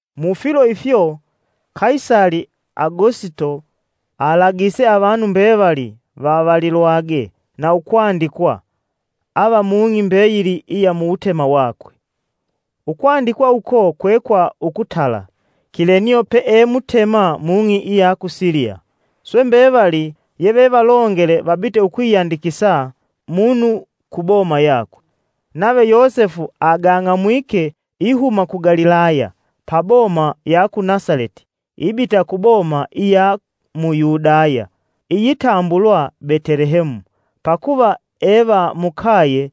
Mufilo ifyo Kaisali Agosito alagise avanu mbevali vavalilwage na ukwandikwa ava mung'i mbeyili iya muwutema wakwe. Ukwandikwa uko kwe kwa ukutala, Kilenio pee mutema mung'i iya ku Siliya. Swe mbevali yevevalongele vabite ukwiyandikisa munu ku boma yakwe. Nave Yosefu agang'amwike ihuma ku Galilaya, pa boma ya ku Nasaleti ibita ku boma iya mu Yudaya iyitambulwa Betelehemu pakuva e va mukaye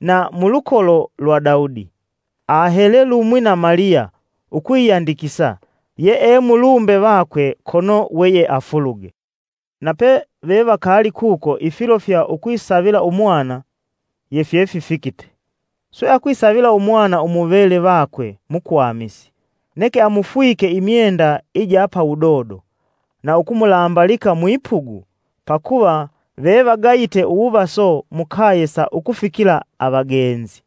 na mulukolo lwa Daudi. Ahele lumwi na Maliya ukwiyandikisa yee mulumbe vakwe kono weyeafuluge. Na pevevakaali kuko ifilo fya ukwisavila umwana yefyefifikite. Swe akwisavila umwana umuvele vakwe mukwamisi, neke amufwike imyenda ija pawudodo na ukumulambalika mwipugu pakuva vevagayite uwuvaso mukaye sa ukufikila avagenzi.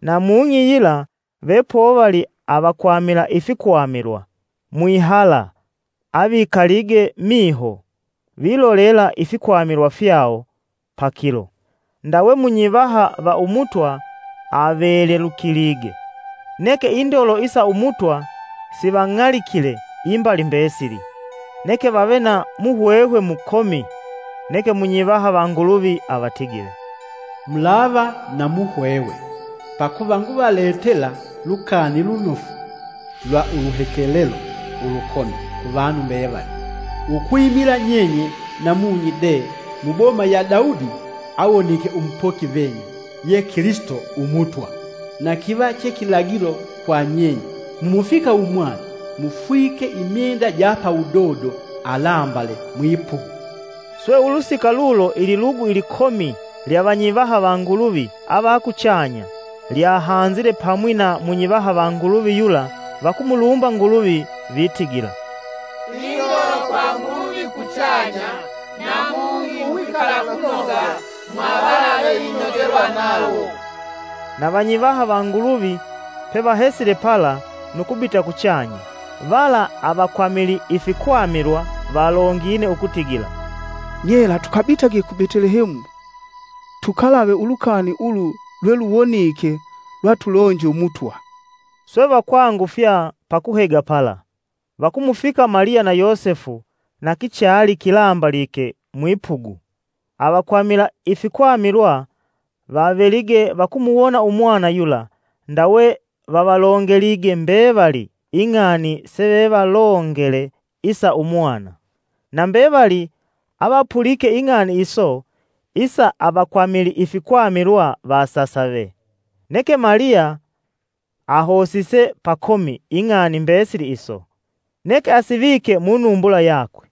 Na mung'i yila vepovali avakwamila ifikwamilwa mwihala avikalige miho vilolela ifikwamilwa fyawo pa kilo. Ndawe munyivaha va Umutwa avelelukilige, neke indolo isa Umutwa sivang'alikile imbali mbesili. Neke vave na muhwehwe mukomi. Neke munyivaha va Nguluvi avatigile, “Mulava na muhwehwe! Pakuva nguvaletela Lukani Lunofu lwa uluhekelelo ulukomi, kuvanu mbevali. Ukwimila nyenye namunyi de muboma ya Daudi awonike umupoki venyu, ye Kilisito Umutwa. Na kiva che kilagilo kwa nyenye: mumufika umwana mufwike imyenda ja pawudodo, alambale mwipugu.” Swe ulusika lulo ililugu ilikomi lya vanyivaha va Nguluvi avakuchanya lyahanzile pamwi na munyivaha va Nguluvi yula vakumulumba Nguluvi vitigila: “Indolo kwa Nguluvi kuchanya, na mung'i uwikalakunoga mwa vala veinogelwa nawo!” Na Vanyivaha va Nguluvi pevahesile pala nu kubita kuchanya, vala avakwamili ifikwamilwa valongine: ukutigila, “Nyela tukabitage ku Betelehemu tukalave ulukani ulu lwe luwonike lweatulonje Umutwa.” Swe vakwangufya pa kuhega pala, vakumufika Maliya na Yosefu na kichali kilambalike mwipugu. Avakwamila ifikwamilwa vavelige vakumuwona umwana yula, ndawe vavalongelige mbevali ing'ani sevevalongele isa umwana. Na mbevali avapulike ing'ani iso, isa avakwamili ifikwamilwa vasasave. Neke Maliya ahosise pakomi ing'ani mbesili iso, neke asivike munumbula yakwe.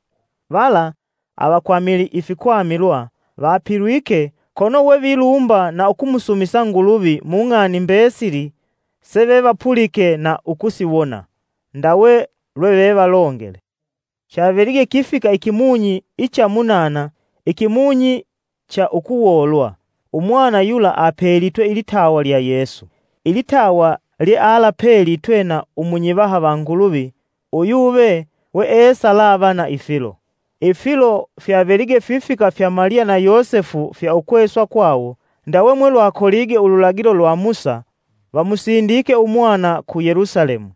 Vala avakwamili ifikwamilwa vapilwike kono we vilumba na ukumusumisa Nguluvi mung'ani mbesili sevevapulike na ukusiwona; ndawe lwevevalongele. Chavelige kifika ikimunyi icha munana ikimunyi cha ukuwoolwa, umwana yula apelitwe ilitawa lya Yesu, ilitawa lyealapelitwe na umunyivaha va Nguluvi uyuve weesalava na ifilo. Ifilo fyavelige fifika fya Maliya na Yosefu fya ukweswa kwawo, ndawe mwelwakolige ululagilo lwa Musa, vamusindike umwana ku Yelusalemu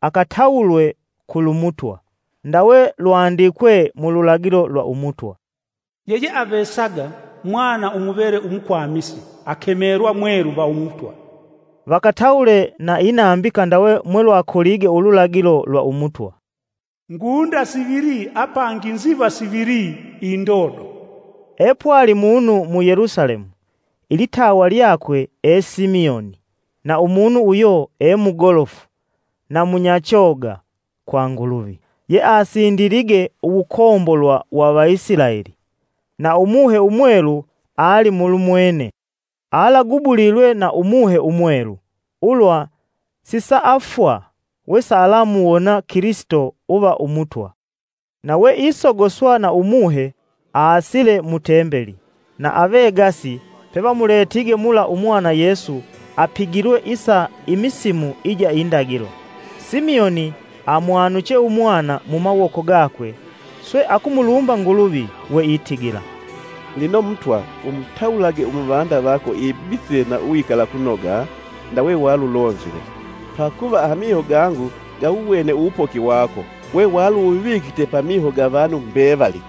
akatawulwe kulumutwa, Ndawe lwandikwe mululagilo lwa Umutwa, “Yeyeavesaga mwana umuvele umukwamisi akemelwa mwelu va Umutwa.” Vakatawule na inambika ndawe mwelwakolige ululagilo lwa Umutwa, “Ngunda sivili apangi nziva sivili indodo.” Epwali munu mu Yelusalemu, ilitawa lyakwe e Simioni, na umunu uyo e mugolofu na munyachoga kwa Nguluvi, yeasindilige uwukombolwa wa Vaisilaeli. Na Umuhe Umwelu alimulumwene. Alagubulilwe na Umuhe Umwelu ulwa sisaafwa wesalamuwona Kilisito uva Umutwa. Na we isogoswa na Umuhe aasile mu tembeli; na avegasi pevamuletige mula umwana Yesu, apigilwe isa imisimu ija indolo, Simioni amwanuche umwana mumawoko gakwe swe akumulumba Nguluvi weitigila, “Lino Mutwa umutawulage umuvanda vako ibitile na uwikalakunoga, ndawe walulonzile. Pakuva amiho gangu gawuwene uwupoki wako. We waluuwuvikite pamiho ga vanu mbevali: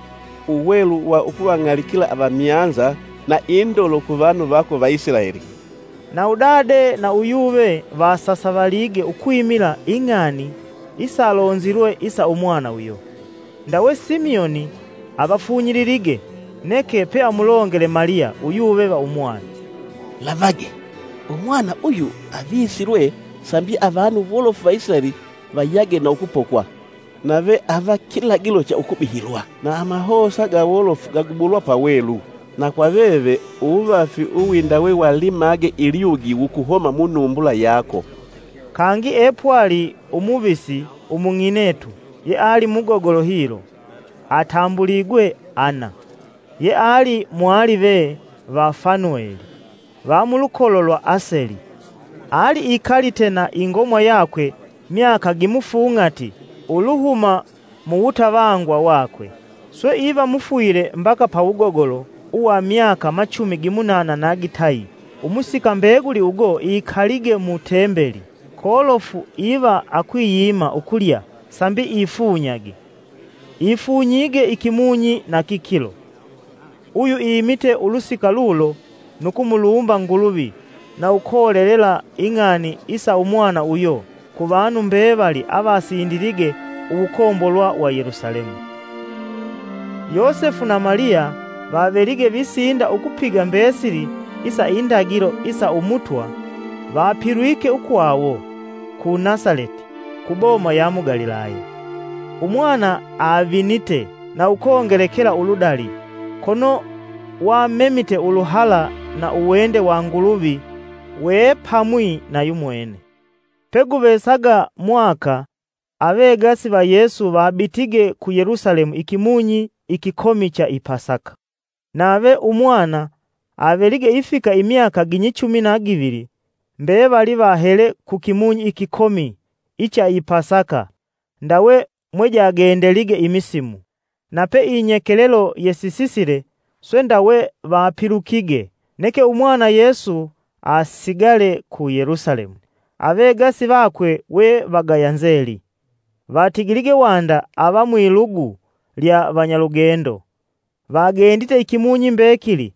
Uwelu wa ukuvang'alikila avamyanza, na indolo ku vanu vako Vaisilaeli.” Na udade na uyuve vasasavalige ukwimila ing'ani isalonzilwe isa umwana uyo. Ndawe Simioni avafunyililige neke peamulongele Maliya uyuve va umwana, “Lavage Umwana uyu avisilwe sambi avanu wolofu va Isilaeli vayage na ukupokwa. Nave ava kilagilo cha ukubihilwa; na amahosa ga wolofu gagubulwa pawelu. Na kwa veve uwuvafi uwindawe wa limage ilyugi wukuhoma munumbula yako.” Kangi epwali umuvisi umung'inetu yeali mugogolo hilo, atambuligwe Anna, yeali mwalive va Fanueli, va mulukolo lwa Aseli. Ali ikalite na ingomwa yakwe myaka gimufung'ati uluhuma muwutavangwa wakwe. Swe iva mufwile mbaka pawugogolo uwa myaka machumi gimunana na gitayi umusika mbeguli ugo ikalige mu Tembeli, kolofu iva akwiyima ukulya sambi ifunyage, ifunyige ikimunyi na kikilo. Uyu imite ulusika lulo, nu kumulumba Nguluvi na ukolelela ing'ani isa umwana uyo kuvanu mbevali avasindilige uwukombolwa wa Yelusalemu. Yosefu na Maliya vavelige visinda ukupiga mbesili isa indagilo isa umutwa, vapilwike ukwawo ku Nasaleti, ku boma ya mu Galilaya. Umwana avinite na ukongelekela uludali, kono wamemite uluhala na uwende wa Nguluvi we pamwi na yumwene. Peguvesaga mwaka avegasi va Yesu vabitige ku Yelusalemu ikimunyi ikikomi cha i Pasaka. Nave umwana avelige ifika imyaka ginyichumi na givili, mbevali vahele ku kimunyi ikikomi icha i pasaka ndawe mwejagendelige imisimu. Na pe inyekelelo yesisile, swe ndawe vapilukige, neke umwana Yesu asigale ku Yelusalemu. Avegasi vakwe we vagaya nzeli. Vatigilige wanda ava mwilugu lya vanyalugendo, vagendite ikimunyi mbekili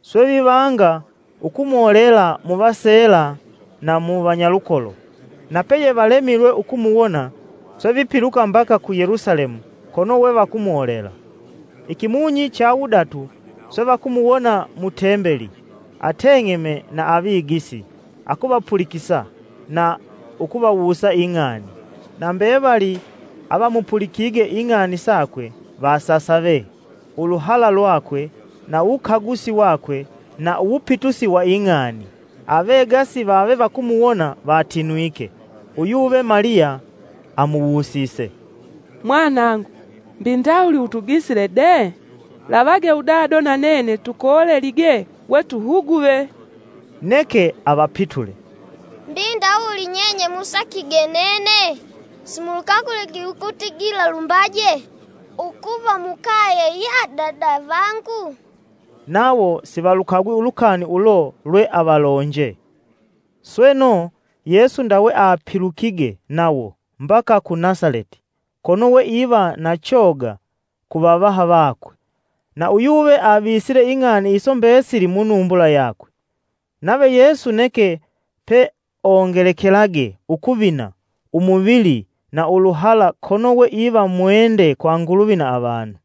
swe vivanga ukumolela muvaseela na mu vanyalukolo. Na peyevalemilwe ukumuwona, swe vipiluka mbaka ku Yelusalemu kono we vakumolela. Ikimunyi cha wudatu swe vakumuwona mu tembeli, ateng'eme na avigisi, akuvapulikisa na ukuvawusa ing'ani. Na mbevali avamupulikige ing'ani sakwe vasasave uluhala lwakwe na uwukagusi wakwe na uwupitusi wa ing'ani. Avegasi vave vakumuwona vatinwike. Uyuve Maliya amuwusise, “Mwanangu mbi ndawuli utugisile de? Lavage udado na nene tukolelige we tuhuguve.” Neke avapitule, “Mbi ndawuli nyenye musakige nene? Simulukaguligi ukutigila lumbaje ukuva mukaye ya Dada vangu?” Nawo sivalukagwi ulukani ulo lwe avalonje. Sweno, Yesu ndawe apilukige nawo, mbaka ku Nasaleti. Kono we iva na choga kuvavaha vakwe, na uyuve avisile ing'ani iso mbesili munumbula yakwe. Nave Yesu neke peongelekelage ukuvina umuvili na uluhala, kono we iva mwende kwa Nguluvi na avanu.